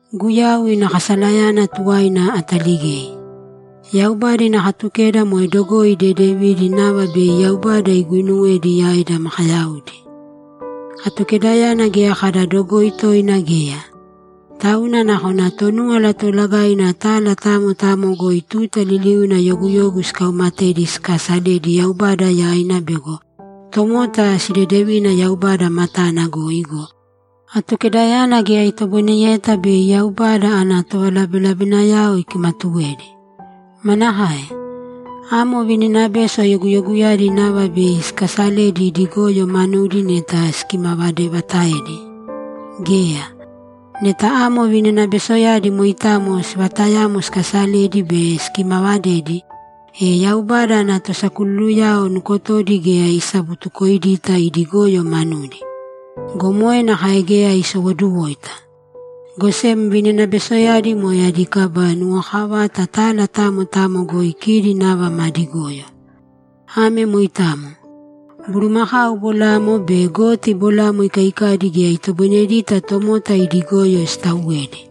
Guyau ina kasalayana tuwaina ataligei. Yaubada ina Katukeda moe dogoi dedevidi nava bei Yaubada iguuinuwedi yaida makayaudi. Atukedayana geya kada dogoi toina geya. Tauna nakona Tonúwala Toolagaina tala tamo tamo goi tuta liliuna yoguyogu sikaumatedi sikaasaledi Yaubada yaina bego tomota sidedevina Yaubada matana goi go, Atukedayana geya itoboineyeta bei Yaubada ana tovalabelabenayao ikimatuwedi. Manakae? Amo vininabeso yoguyoguyadi nava bei sikaasaledi idi goyo manudi neta sikimavadevataedi? Geya! Neta amo vininabesoyadi moitamo sivatayamo sikasaledi be sikimavadedi, e Yaubada ana tosakululuyao nukotodi geya isabutukoidita idi goyo manudi. Go moe nakae geya isowoduwoita! Go sem vininabesoyadi moe adi kaba nuwokavata tala tamo tamo goi kidi nava madi goyo. Ame moitamo. Bulumakau bolamo be goti bolamo ikaikaidi geya itoboinedita tomota ida goyo sitauwedi.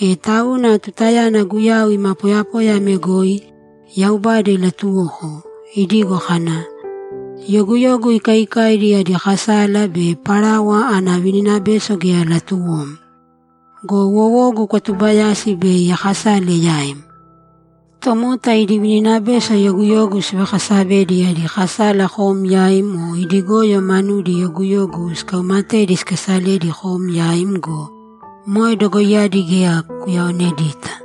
E tauna tutayana Guyau ima poyapoya ame goi, Yaubada ilatuwoko, idigo kana, ‘Yoguyogu ikaikaidi adi kasala be parawa ana vininabeso geya latuwom. Go wowogu kwatubayasi bei akasale yaim. Tomota idi vininabeso yoguyogu sivakasavedi adi kasala kom yaim o idi goyo manudi yoguyogu sikaumatedi sikasaledi kom yaim go, moe dogoiyadi geya kuuyaonedita.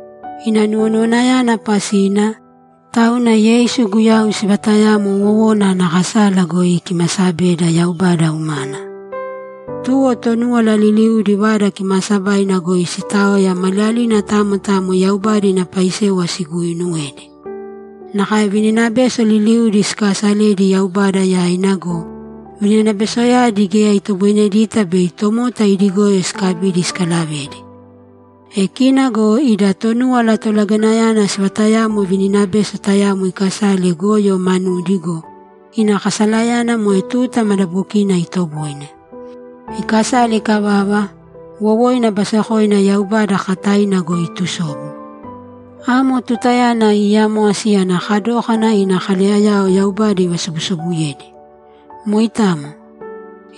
Ina nuwonuwanayana pasina, tauna Yeisu Guyau sivatayamo wowona ana kasala goi ikimasabeda Yaubada umana. Tuwo Tonúwala liliudi Vada Kimaasabaina goi siitaoya maliyalina tamo tamo Yaubada ina paisewa siguuinuwedi; nakae vininabeso liliudi sikaasaledi Yaubada yaina go, vininabesoyadi geya itoboinedita bei tomota idi goyo sikabidi sikalavedi. E kina go ida Tonúwala Tolagainayana sivatayamo vininabeso tayamo ikasale goyo manudi go, ina kasalayana moe tuta madabokina itoboine. Ikasale ikavava, wowoina basekoina Yaubada kakataina goi itusobu. Amo tutayana iiyamwasi ana kadókana ina kaleyayao Yaubada ivasobusobuyedi. Moitamo.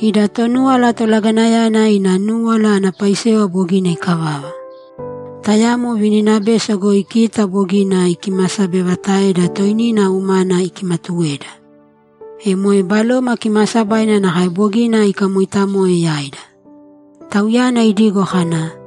Ida Tonúwala Tolagainayana ina núwala ana paisewa bogina ikavava. Tayamo vininabeso goi kita bogina ikimasabevataeda toinina umana ikimatuweda. E moe Baloma Kimaasabaina nakae bogina ikamoitamoe yaida. Tauyana idigo kana,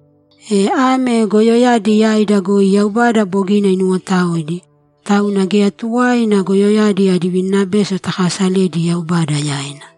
E ame goyoyadi yaida goi Yaubada bogina inuwotaoidi, tauna geya tuwaina goyoyadi adi vininabeso takasaledi Yaubada yaina!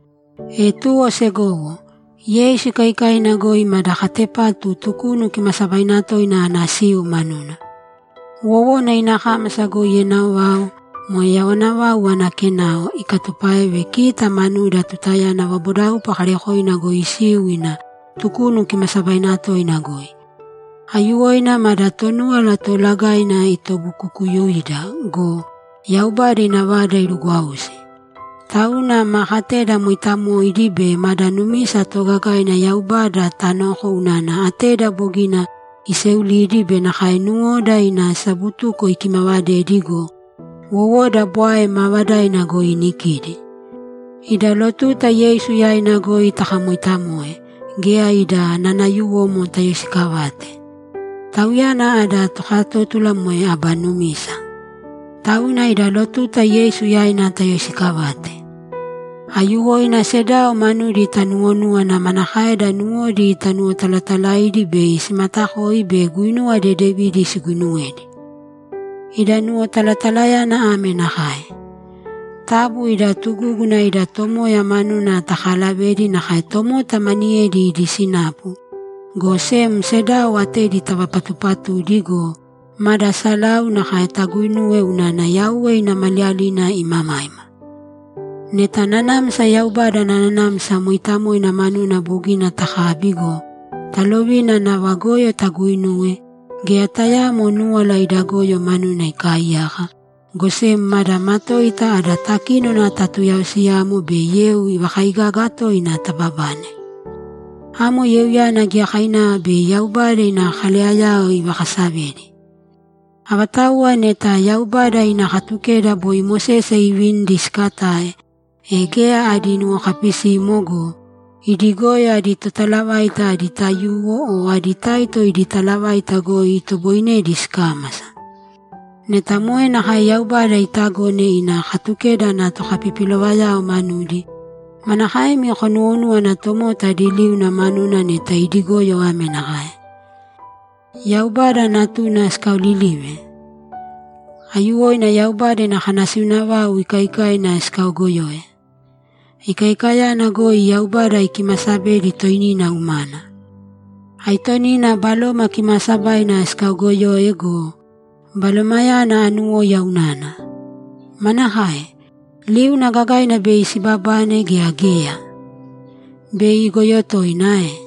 E tuwo segowo, Yeisu ikaikaina goi mada katepatu Tukunu Kimaasabaina Toina ana siu manuna. Wowona ina kámasa goi enao vau, moe yawana vau ana kenao, ikatupáeve kita manuda tutayana vabodaupa kaarekoina goi isiu ina Tukunu Kimaasabaina Toina goi. Aiyuwoina mada Tonúwala Toolagaina itobukukuyuida go, Yaubada ina Vada irugwausi. Tauna ma kateda mooitamoidi be mada numisa toogagaina Yaubada tanōko unana ateda bogina iseulidi be nakae nuwoda ina sabutuko ikimavadedi go, wowoda bwae maavadaina goi inikidi. Ida lotuta Yeisu yaina goi takamooitamoe, geya ida nanayuwomo tayoisikavāte. Tauyana ada tokatótula moe aba numisa. Tauna ida lotuta Yeisu yaina tayoisikavāte. Aiyuwoina sedao manudi tanuwonūwana manakaeda nuwodi tanuwotalatalaidi bei simatakoi be guinuwa dedevidi siguinuwedi. Ida nuwotalatalayana ame nakae: Taabu ida tugúguna ida Tomoya manuna takaalavēdi nakae tomota maniyedi idi sinapu, go sem sedao atedi tavapatupatūdi go, mada salau nakae taguuinūwe unana Yauwe ina Maliyalina imamaima. Neta nanamsa Yaubada ana Nanamsa Mooitamoina manuna bogina takabi go, talovina nava goyo taguuinuwe, geya tayaamo núwala ida goyo manuna ikaaiyaka, go sem mada matoita ada takínona tatuyaosiyamo be yeu ivakaigaga toina tababane. Amo yeuyana giyakainava bei Yaubada ina kaleyayao ivakasavedi. Avatauwa neta Yaubada ina Katukeda boi Mosese iivinidi sikatae, e geya adi nuwokapisimo go, idi goyo adi totalavaita adi taiyuwo o adi taito idi talavaita goi itoboinedi sikámasa. Neta moe nakae Yaubada itagone ina Katukeda ana tokapipilovayao manudi, manakaemi konuwonúwana tomota adi liuna manuna neta idi goyo ame nakae: Yaubada Natuna sikaolilive? Aiyuwoina Yaubada ina kanasiuna vau ikaikaina sikaogoyoe. Ikaikayana goi Yaubada ikimasabedi toinina umana. Aitonina Baloma Kimaasabaina sikaogoyoe go, Balomayana anuwóiya unana. Manakae? Liuna gagaina bei sibabane gea geya? Bei igoyo toina ae?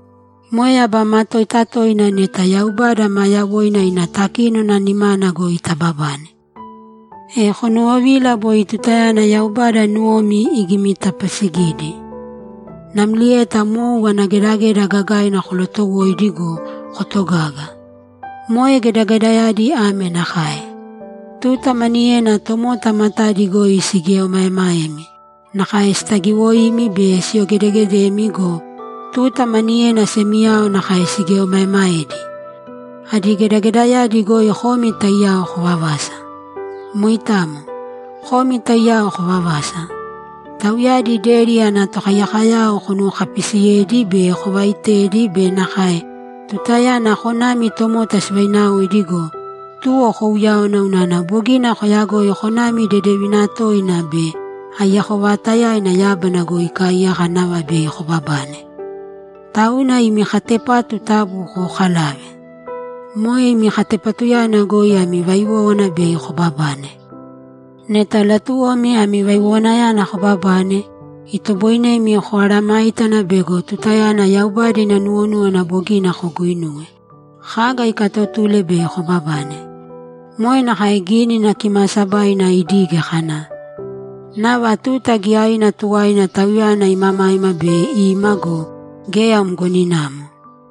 Moe aba matoita toina neta Yaubada maa yawoina ina takínona nimana goi tababane. E konuwovīla boi tutayana Yaubada nuwomi igimitapasigidi, namlieta mou ana gedageda gagaina kolotowoidi go, kotogaga. Moe gedagedayadi ame nakae: Tuta maniyena tomota matadi goi sigieomaemaemi, nakae sitagiwoimi be siyogedegedemi go, tuta maniyena semiyao nakae sigieomaemaedi; adi gedagedayadi goi komi taiyao kovavasa. Moitamo. Komi taiyao kovavasa. Tauyadi deri ana tokaiyakoyao konuwokapisiyedi be kovaitedi be nakae tutayana konami tomota sivainaoidi go, tuwo kouyáwana unana bogina koyagoi konami dedevina toina be aiyako vaatayaina yábana goi ikaaiyaka nava bei kobabane. Tauna imi katepatu taabu kookalāve. Moe imi katepatuyana goi ami vaiwówana bei kobabane. Neta latuwomi ami vaiwowanayana kobabane, itoboinemi komesayágana bego tutayana Yaubada ina nuwonúwana bogina koguinuwe, kaga ikaatotule bei kobabane. Moe nakae Gínina Kimaasabaina idige kana, ‘Nava tuta giyaina tuwaina Tauyana imamaima bei ima go, geya mgoninamo.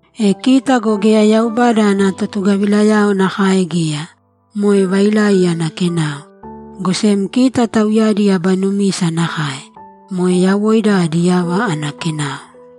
E kita go geya Yaubada ana totugavilayao nakae geya, moe vailai ana kenao. Go sem kita tauyadi aba numisa nakae. Moe yawoida adi yava ana kenao.